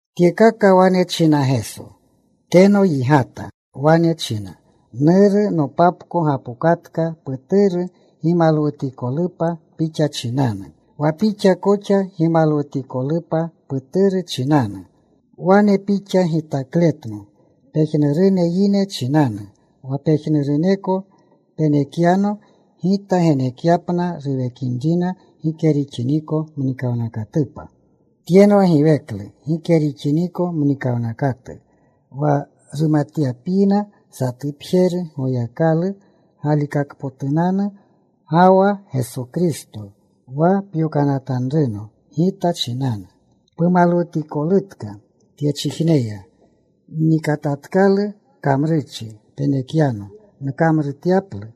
Tyekaka wane china Geso. Teno yigata. Wane china, “Nuru, nopapko gapokatka. Puturu gimalwutikolupa Pixa chinanu, wa Pixa koxa gimalwutikolupa Puturu chinanu. Wane pixa gitakletno pejnurune yine chinanu, wa pejnuruneko penekyano, Gita genekyapna ruwekinrina gike rixiniko mnikawnakatupa. Tyenwa giweklu gike rixiniko mnikawnakatu, wa rumatyapyina, satupjeru Goyakalu galikakpotunanu, ga wa Geso Kristo wa pyokanatanruno. Gita chinanu pumalwutikolutka tyechijneya. Nnikatatkalu kamrurchi penekyano nkamrutyaplu.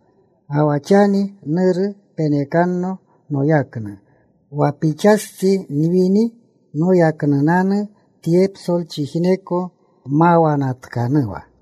Ga wa xani, Nuru, penekanno noyaknu, wa Pixastsi nwini noyaknunanu tye psolchijneko mawanatkanuwa.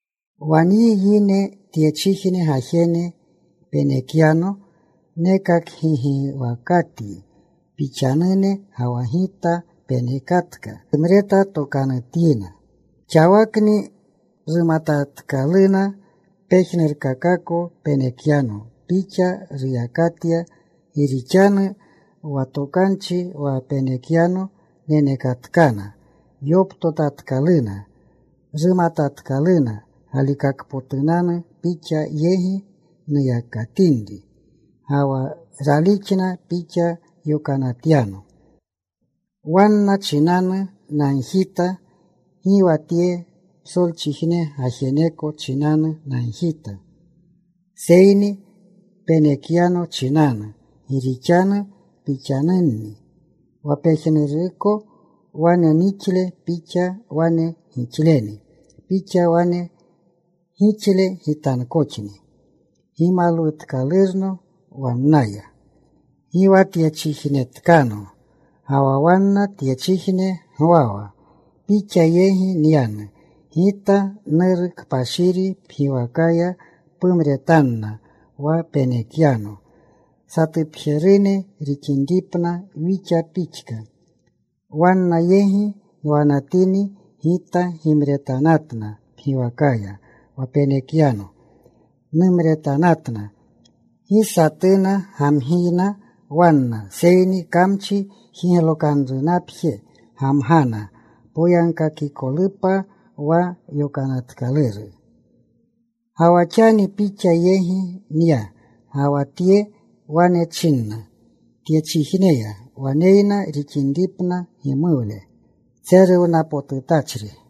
“Wa nyi yine tyechijne gajene penekyano, nekakgigiwakatyi. Pixanune, ga wa Gita penekatka. Rumretatokanutyina. Xawakni rumatatkaluna pejnurkakako penekyano Pixa ruyakatya. Gi rixanu wa tokanchi wa penekyano, nenekatkana. Yoptotatkaluna. Rumatatkaluna galikakpotunanu Pixa yegi nuyakatinri. Ga wa ralixna Pixa yokanatyano. Wanna chinanu nagjita. Gi wa tye psolchijne gajeneko chinanu nagjita, seyni penekyano chinanu, gi rixanu Pixanunni. Wa pejnuruko wane nixle, Pixa wane gixleni. Pixa wane gixle Gitankoxni. Gimalwutkalurno waleya. Gi wa tyechijnetkano, ga wa wanna tyechijne gwawa. Pixa yegi nyanu Gita. Nuru kpashiri, pgiwakaya pumretanna wa penekyano, satupjerune rixinripna, Wixa pixka. Wanna yegi nwanatini, Gita gimretanatna pgiwakaya. Wa penekyano numretanatna. Gi satuna gamgiyna wanna, seyni kamchi jiglokanrunapjeni gamgana, poyagkakikolupa wa yonatkaluru. “Ga wa xani Pixa yegi nya, ga wa tye wane nchina tyechijneya, waneyna rixinripna numuwle tseruwnapotutachri.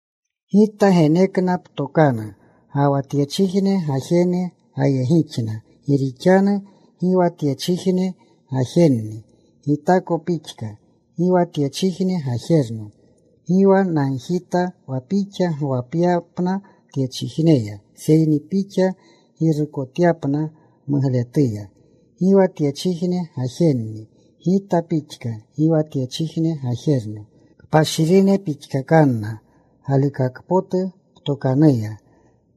Gita genekna ptokanu, ga wa tyechijne gajene gayegixna, gi rixanu gi wa tyechijne gajenni, Gitako pixka, gi wa tyechijne gajerno. Gi wa nagjita wa Pixa gwapyapna tyechijneya, seyni Pixa girukotyapna mugletuya. Gi wa tyechijne gajenni, Gita pixka; gi wa tyechijne gajerno. Kpashirine pixkakanna galikaka potu ptokanuya.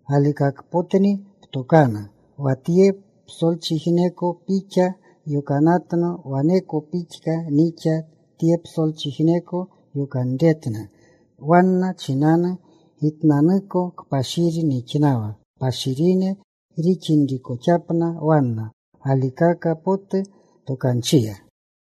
Galikakpotni ptokanu. Wa tye psolchijneko Pixa yokanatno, waneko pixka nixa tye psolchijneko yokanretna. Wanna chinanu Gitnanuko kpashiri nixnawa, kpashirine rixinrikoxapna wanna galikaka potu tokanchiya.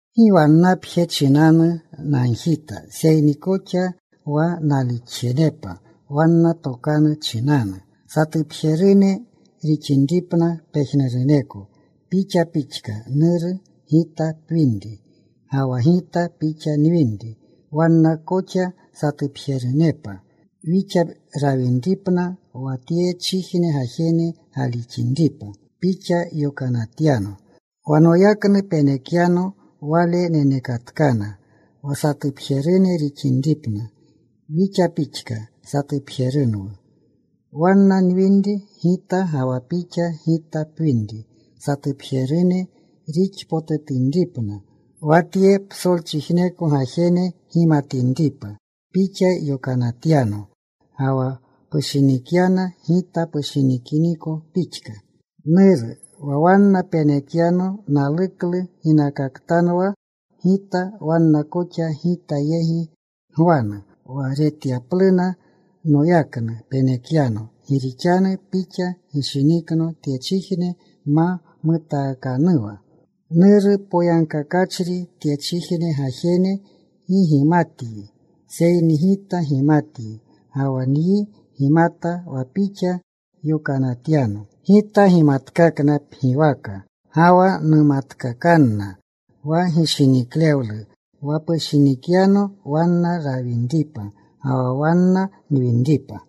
“Gi wannapje chinanu nagjita, seyni koxa wa nalixjenepa wanna tokanu chinanu. Satupjerune rixinripna pejnuruneko, Pixa pixka, Nuru, Gita pwinri, ga wa Gita Pixa nwinri; wanna koxa satupjerunepa Wixa rawinripna, wa tyechijne gajene galixinripa Pixa yokanatyano. Wa noyaknu penekyano, wale nenekatkana. Wa satupjerune rixinripna, Wixa pixka satupjerunwu. Wanna nwinri Gita ga wa Pixa Gita pwinri, satupjerune rixpotutinripna, wa tye psolchiijneko gajene gimatinripa Pixa yokanatyano, ga wa pushinikyana Gita pushinikiniko pixka. “Nuru, wa wanna penekyano naluklu ginakaktanwa Gita, wanna koxa Gita yegi gwanu, wa retyapluna noyaknu penekyano. Gi rixanu Pixa gishinikno tyechijne ma mutaakanuwa. “Nuru poyagkakachri, tyechijne gajene gi gimatyi, seyni Gita gimatyi. Ga wa nyi gimata wa Pixa yokanatyano. Gita gimatkakna pgiwaka, ga wa numatkakanna, wa gishiniklewlu wa pushinikyano wanna rawinripa, ga wa wanna nwinripa.”